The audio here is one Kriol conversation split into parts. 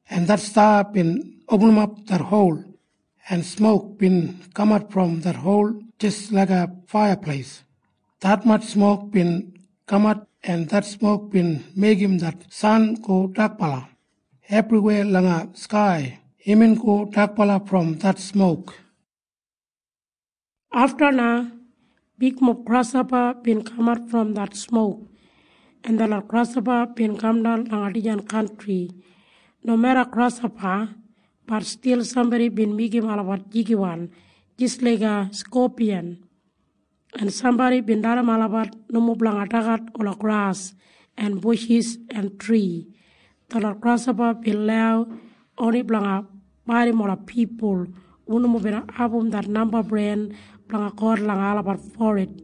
en det sta bin opinim det hol, en smok bin kamat brom det hol jis laiga faiyapleis. Detmatj smok bin kamat, en det smok bin meigim det san go dakbala. Ebriwei langa skai imbin go dakbala brom det smok. Afta na bigmob grashopa bin kamat brom det smok, en detlot grashopa bin kamdan langa dijan kantri. Nomeda grashopa, bat stil sambodi bin meigim olabat jigiwan jis laiga skopiyan, en sambodi bin dalim olabat nomo blanga dagat ola gras en bushis en tri. Detlot grashopa bin lau oni blanga baidim ola pipul hu nomo bin abum det namba bren blanga God langa olabat forid.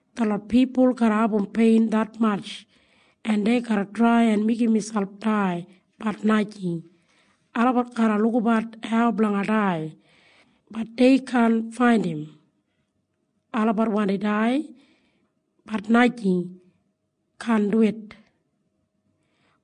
Detlot pipul garra abum pein detmatj, en dei garra trai en meigim miselp dai. Bat najing. Olabat garra lukabat hau blanga dai. Bat dei kaan faindim. Olabat wandi dai. Bat najing, kaan duwit.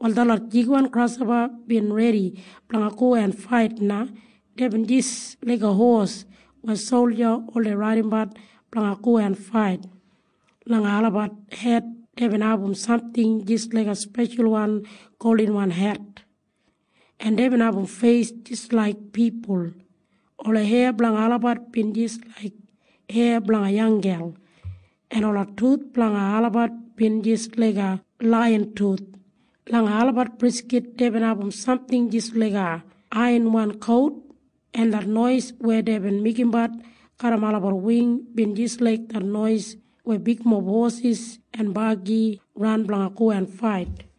Wal detlot jigiwan grashopa bin redi blanga go en fait na. Deibin jis laiga hos weya solja oldei raidimbat blanga go en fait. Langa olabat hed deibin abum samting jis laiga speshalwan goldinwan het, en deibin abum feis jis laik pipul. Ola heya blanga olabat bin jis laik heya blanga yanggel, en ola tuth blanga olabat bin jis laiga laiyan tuth. Langa olabat briskit deibin abum samting jis laiga aiyanwan kout, en det nois weya deibin meigimbat garram olabat wing bin jis laik det nois weya bigmob hosis en bagi ran blanga go en fait.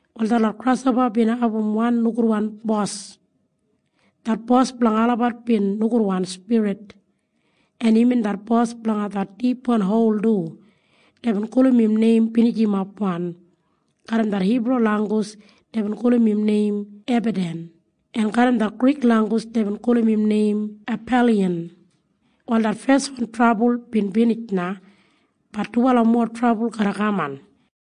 Wal detlot grashopa bin abum wan nogudwan bos. Det bos blanga olabat bin nogudwan spirit, en imbin det bos blanga det dipwan hol du. Deibin gulum im neim Binijimapwan. Garram det Hibru langgus deibin gulum im neim Ebadan, en garram det Grik langgus deibin gulum im neim Apaliyan. Wal det feswan trabul bin binij na. Bat dubala mowa trabul garra kaman.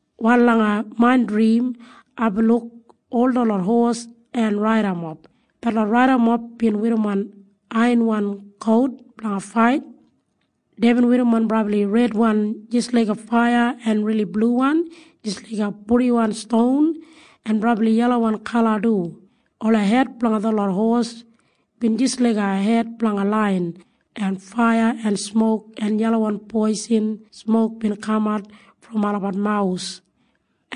Wal langa main drim aibin luk ol detlot hos en raidamob. Detlot raidamob bin werrimon aiyanwan kout blanga fait. Deibin werrimon brabli redwan jis laiga faiya en rili bluwan jis laiga purdiwan ston en brabli yelawan kala du. Ola hed blanga detlot hos bin jis laiga hed blanga laiyan, en faiya en smok en yelawan poisin smok bin kamat brom olabat mawus.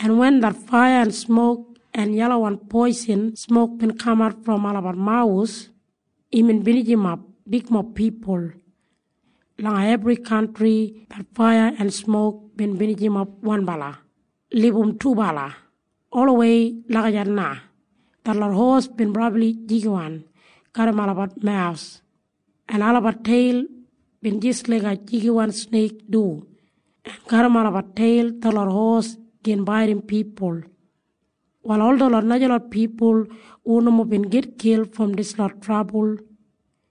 En wen det faiya en smok en yelawan poisin smok bin kamat brom olabat mawus, imbin binijimap bigmob pipul. Langa ebri kantri det faiya en smok bin binijimap wanbala, libum dubala, olawei lagijat na. Detlot hos bin brabli jigiwan garram olabat mawus, en olabat teil bin jis laiga jigiwan sneik du, en garram olabat teil detlot hos gin baidim pipul. Wal ol detlot najalot pipul hu nomo bin gitkil brom dislot trabul,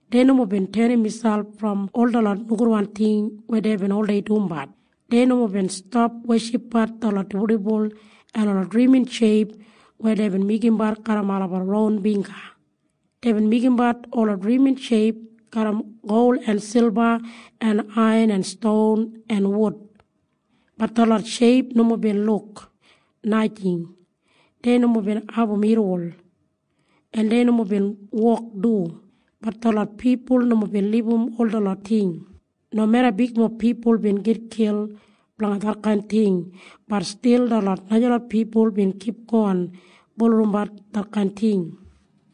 dei nomo bin tenim miselp brom ol detlot nogudwan ting weya deibin oldei dumbat. Dei nomo bin stap weshipbat detlot dibuldibul en ola drimin sheip weya deibin meigimbat garram olabat ron bingga. Deibin meigimbat ola drimin sheip garram gol en silba en aiyan en ston en wud. Bat detlot sheip nomo bin luk, najing. Dei nomo bin abum irriwol, en dei nomo bin wok du. Bat detlot pipul nomo bin libum ol detlot ting. Nomeda bigmob pipul bin gitkil blanga detkain ting, bat stil detlot najalot pipul bin kipgon bulurrumbat detkain ting.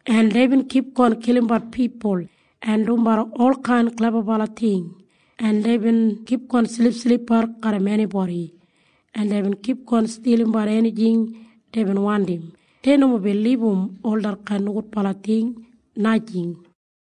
En deibin kipgon kilimbat pipul en dumbat olkain klebabala ting, en deibin kipgon silipsilipbat garram enibodi, en deibin kipgon stilimbat enijing deibin wandim. Dei nomo bin libum ol detkain nogudbala ting, najing.